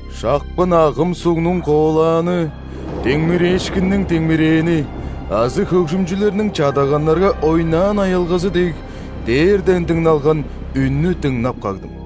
Шапкын агым сугнуң коолааны, диңмирээшкинниң диңмирээни азы хөгжүмчүлерниң чадаганнарга ойнаан аялгазы дег, дээрден дыңналган үннү дыңнап кагдым.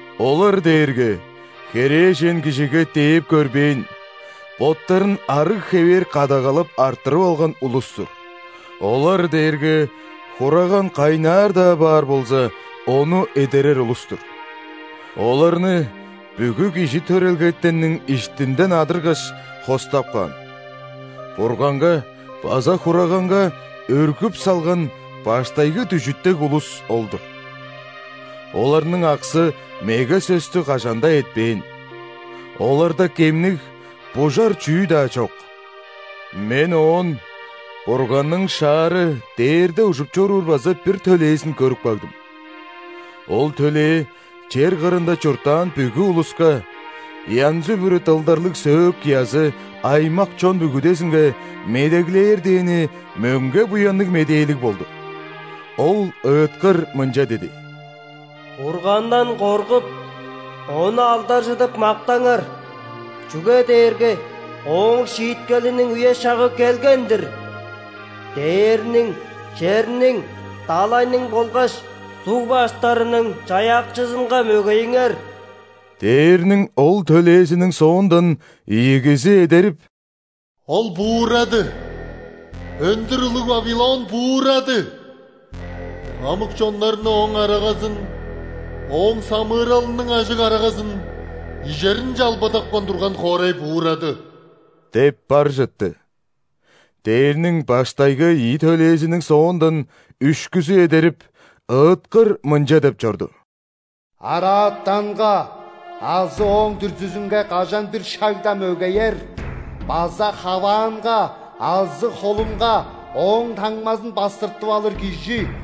Олар дээрге херээжен кижиге дээп көрбээн, боттарын арыг хевээр кадагалап арттырып алган улус-тур. Олар дээрге, Хураган кайнаар-даа баар болза, Ону эдерер улус-тур. Оларны бүгү кижи төрелгетенниң иштинден адыргаш, хостап каан; Бурганга база Хураганга өргүп салган баштайгы дүжүт дег улус ол-дур. Оларның аксы меге сөстү кажан-даа этпээн, оларда кемниг, бужар чүү-даа чок. Мен оон Бурганның шаары дээрде ужуп чоруур база бир төлээзин көрүп кагдым. Ол төлээ чер кырында чурттаан бүгү улуска: янзы-бүрү дылдарлыг сөөк-язы, аймак-чон бүгүдезинге медеглээр дээни мөңге Буянныг Медээлиг болду. Ол ыыткыр мынча диди: «Бургандан коргуп, Ону алдаржыдып мактаңар, чүге дээрге Ооң шииткелиниң үе-шагы келген-дир. Дээрниң, черниң, далайның болгаш суг баштарының Чаяакчызынга мөгейиңер!» Дээрниң ол төлээзиниң соондан ийигизи эдерип: «Ол буурады! Өндүр улуг Вавилон буурады! Хамык чоннарны ооң арагазын – ооң самыыралының ажыг арагазын ижеринче албадапкан турган хоорай буурады!» – деп бар чытты. Дээрниң баштайгы ийи төлээзиниң соондан үшкүзү эдерип, ыыткыр мынча деп чорду: «Араатанга азы ооң дүрзүзүнге кажан-бир шагда мөгеер база хаваанга азы холунга ооң таңмазын бастыртып алыр кижи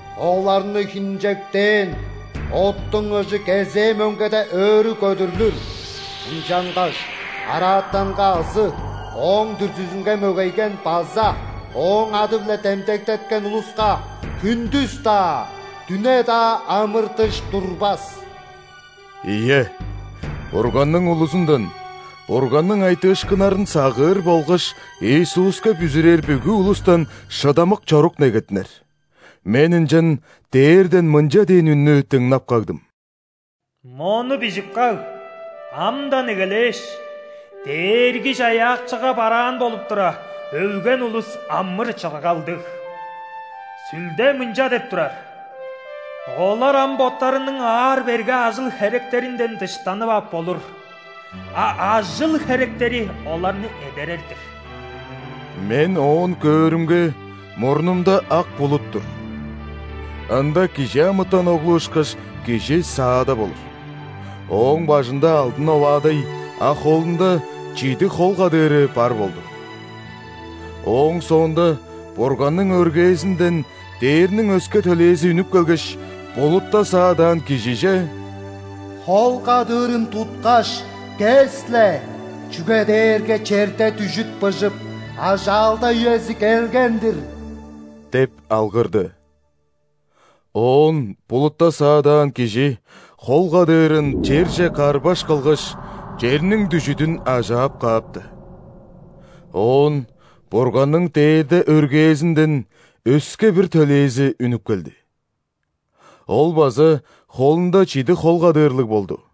Оларны хинчектээн оттуң ыжы кезээ мөңгеде өрү көдүрлүр, ынчангаш араатанга азы ооң дүрзүзүнге мөгейген база ооң ады-биле демдектеткен улуска хүндүс-даа, дүне-даа амыр-дыш турбас». Ийе, Бурганның улузундан – Бурганның айтыышкыннарын сагыыр болгаш Иисуска бүзүрээр бүгү улустан шыдамык чорук негеттинер. Мен ынчан дээрден мынча дээн үннү дыңнап кагдым: «Мону бижип каг: амдан эгелээш, Дээрги-Чаяакчыга бараан болуп тура, өлген улус – амыр-чыргалдыг. Сүлде мынча деп турар: „Олар ам боттарының аар-берге ажыл-херектеринден дыштанып ап болур, а ажыл-херектери оларны эдерер-дир“». Мен оон көөрүмге, мурнумда ак булут тур. Ында ·кижи амытан оглу ышкаш Кижи саадап олур, Ооң бажында алдын оваадай, а холунда чидиг хол кадыыры бар болду. Ооң соонда Бурганның өргээзинден дээрниң өске төлээзи үнүп келгеш, булутта саадаан Кижиже: «Хол кадыырын туткаш, кес-ле, чүге дээрге черде дүжүт быжып, ажаалда үези келген-дир» – деп алгырды. Оон булутта саадаан Кижи хол кадыырын черже карбаш кылгаш, черниң дүжүдүн ажаап каапты. Оон Бурганның дээрде өргээзинден өске бир төлээзи үнүп келди. Ол база холунда чидиг хол кадыырлыг болду.